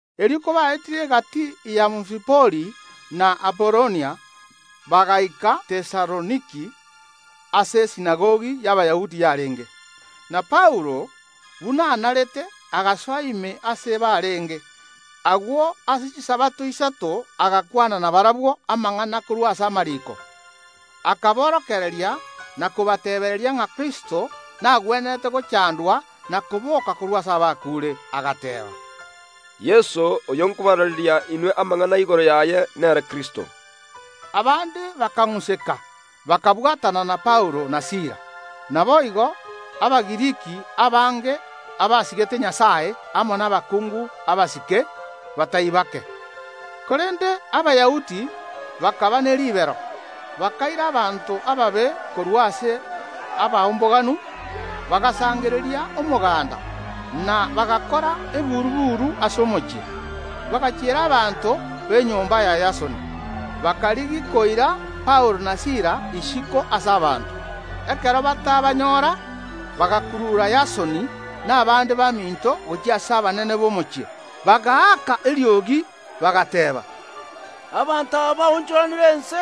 Erio kobaetire egati y’Amfipoli na Apolonia, bagaika Tesaloniki aase esinagogi y’Abayahudi yarenge. Na Paulo, buna anarete, agasoa ime aase barenge. Agwo ase Chisabato isato agakwana nabarabwo amang’ana korwa ase amariiko, akaborokereria na kobateebereria ng’a Kristo nagwenerete gochandwa na koboka korwa ase abakuure, agateeba: “Yeso, oyo nkobaraareria inwe amang’ana igoro yaye, nere Kristo.” Abande bakang’useka, bakabwatana na Paulo na Sila, naboigo Abagiriki abange abasigete Nyasae amo nabakungu abasike batari bake. Korende Abayahudi bakaba ne ribero, bakaira abanto ababe korwa ase abaomboganu, bagasangereria omoganda, na bagakora eburu‐buru ase omochie. Bagachiera abanto b’enyomba ya Yasoni, bakarigia koira Paulo na Sila isiko ase abanto. Ekero batabanyora, bagakurura Yasoni na abande baminto gochia ase abanene b’omochie, bagaaka eriogi, bagateeba: “Abanto aba abaonchoranire ense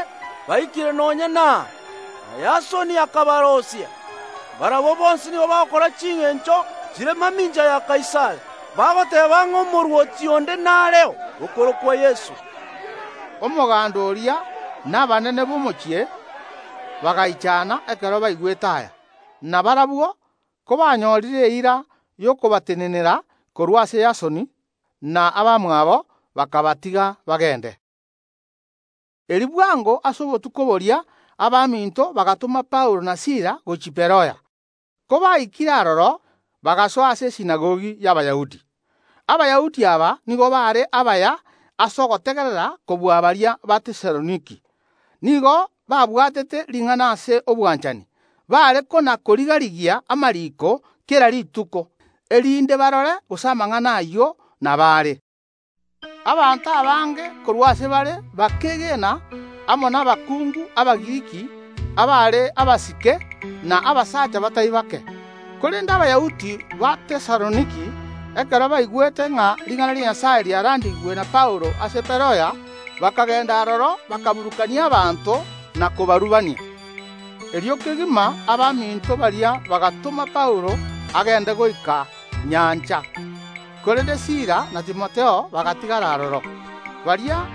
baikire nonya naa, na Yasoni akabaroisia. Barabwo bonsi nigo bagokora chingencho chire mamincha ya Kaisari, bagoteeba ng’a omorwoti onde nareo, okorokwa Yeso.” Omoganda oria na abanene b’omochie bagaichana ekero baigwete aya. Na barabwo kobanyorire eira y’okobatenenera korwa ase Yasoni na abamwabo, bakabatiga bagende. Erio bwango kegima ase obotuko boria abaminto bagatoma Paulo na Sila gochia Beroya. Kobaikire aroro, bagasoa ase esinagogi y’Abayahudi. Abayahudi aba nigo baare abaya ase ogotegerera kobua baria ba Tesaloniki; nigo babwatete Ring’ana ase obwanchani, bare kona‐koriga‐rigia amariiko kera rituko, erinde barore gose amang’ana ayio nabo are. Abange b’abaanto korwa ase bare bakeegena amo nabakungu Abagiriki abaare abasike, na abasacha batari bake. Korende Abayahudi ba Tesaloniki, ekero baigwete ng’a ring’ana ria Nyasae riarandigwe na Paulo ase Beroya, bakagenda aroro bakaburukania abanto na kobarubania. Erio kegima abaminto baria bagatoma Paulo agende goika nyancha, korende Sila na Timotheo bagatigara aroro. Baria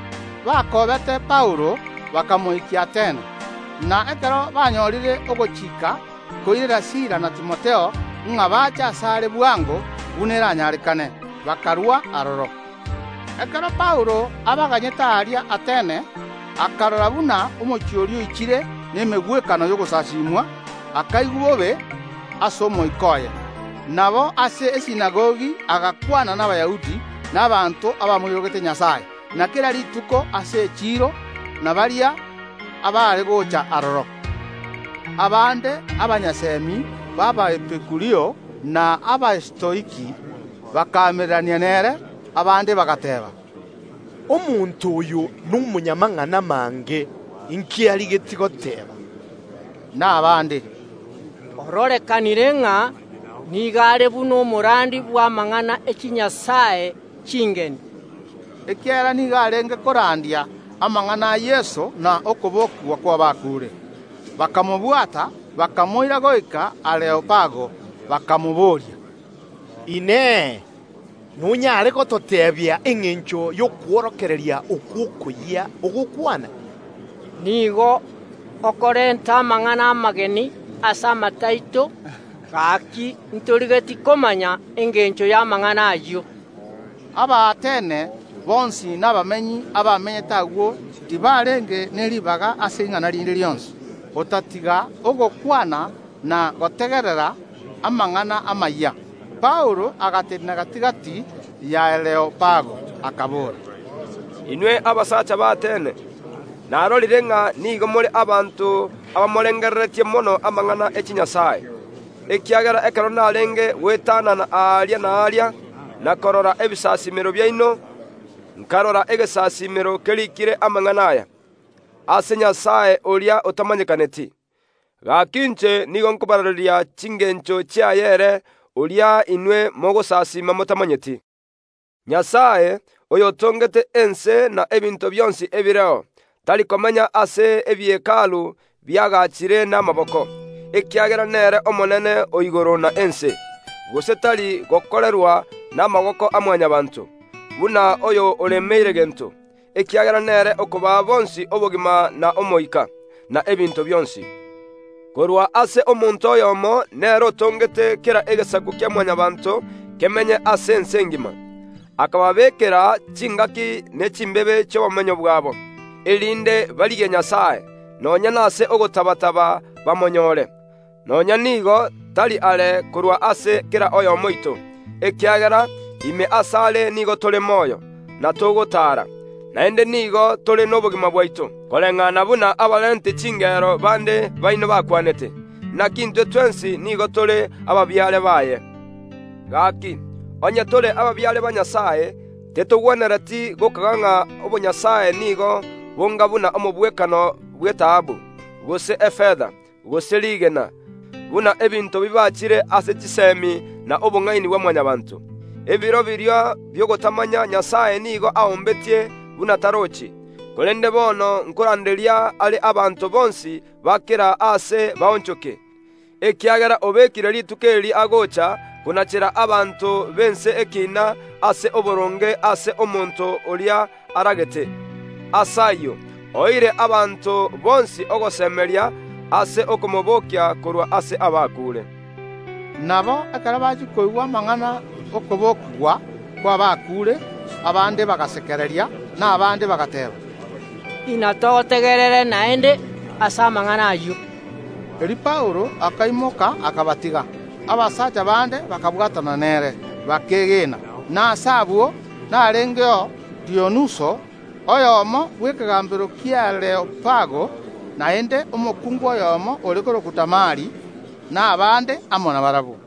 bakoobete Paulo bakamoikia Atene, na ekero banyorire ogochika koirera Sila na Timotheo ng’a bache asare bwango buna eranyarekane, bakarua aroro. Ekero Paulo abaganyete aria Atene, akarora buna omochie oria oichire nemegwekano y’ogosasimwa, akaigwa bobe ase omoika oye. Nabo ase esinagogi agakwana n’Abayahudi na abanto abamoirogete Nyasae, na kera rituko ase echiiro nabaria abaare gocha aroro. Abande abanyasemi b’Abaepikurio na Abastoiki bakaamererania nere. Abande bagateeba: “Omonto oyo nomonyamang’ana mange, inki arigetie goteeba?” Na abande: “Ororekanire ng’a nigo are buna omorandia bw’amang’ana e chinyasae chingeni”, ekiagera nigo arenge korandia amang’ana a Yeso na okobokigwa kw’abakuure. Bakamobwata, bakamoira goika Areopago, bakamobooria: “Inee! Nonyare gototeebia engencho y’okworokereria okwo okoyia ogokwana? Nigo okorenta amang’ana amageni ase amato aito; gaki ntorigetie komanya engencho y’amang’ana ayio.” Abaatene bonsi na abamenyi abamenyete agwo tibarenge ne ribaga ase ing’ana rinde rionsi, otatiga ogokwana na gotegerera amang’ana amayia. Paulo agatenena gati‐gati y’Areopago, akabora: Inwe abasacha b’Atene! Narorire ng’a nigo more abanto abamorengereretie mono amang’ana e chinyasae, ekiagera ekero narenge goetanana aria na aria, na korora ebisasimero biaino, nkarora egesasiimero keriikire amang’ana aya: GOCHIA ASE NYASAE ORIA OTAMANYEKANETI. Gaki inche nigo nkobaraareria chingencho chiaye ere oria inwe mogosasiima motamanyeti. Nyasae, oyotongete ense na ebinto bionsi ebireo, tari komenya ase ebie Hekalu biagachire namaboko, ekiagera nere Omonene o igoro na ense, gose tari gokorerwa namaboko a Mwanyabaanto, buna oyo oremeire gento, ekiagera nere okobaa bonsi obogima na omoika, na ebinto bionsi. Korwa ase omonto oyomo nere otongete kera egesaku kia Mwanyabaanto kemenye ase ense engima, akababeekera chingaki ne chimbebe chi’Obomenyo bwabo, erinde barigie Nyasae, nonya nase ogotaba‐taba bamonyore. Nonya nigo tari are korwa ase kera oyomo oito, ekiagera: Ime asare nigo tore moyo, na togotaara, naende nigo tore nobogima bwaito; koreng’ana buna abarenti chingero bande baino bakwanete: Naki intwe twensi nigo tore ababiare baye. Gaki, onye tore ababiare ba Nyasae, tetogwenereti gokaga ng’a obonyasae nigo bonga buna omogwekano bw’etaabu, gose efeta, gose rigena, buna ebinto bibaachire ase chisemi na obong’aini bwa Mwanyabaanto. Ebiro biria bi’ogotamanya Nyasae nigo aombetie buna tarochi, korende bono nkoranderia are abanto bonsi ba kera aase baonchoke, ekiagera obekire rituko eri agocha konachera abanto b’ense ekiina ase oboronge ase omonto oria aragete. Ase ayio oeire abanto bonsi ogosemeria ase okomobokia korwa ase abakuure. Nabo ekero bachia koigwa amang’ana ’okobokigwa kw’abakuure abande bagasekereria, na abande bagateeba: “Inatogotegerere naende ase amang’ana ayio.” Erio Paulo akaimoka akabatiga. Abasacha bande bakabwatana nere, bakeegena, na ase abwo narengeo Dionuso, oyomo bw’ekegambero ki’Areopago, naende omokungu oyomo ore korokwa Damari, na abande amo nabarabwo.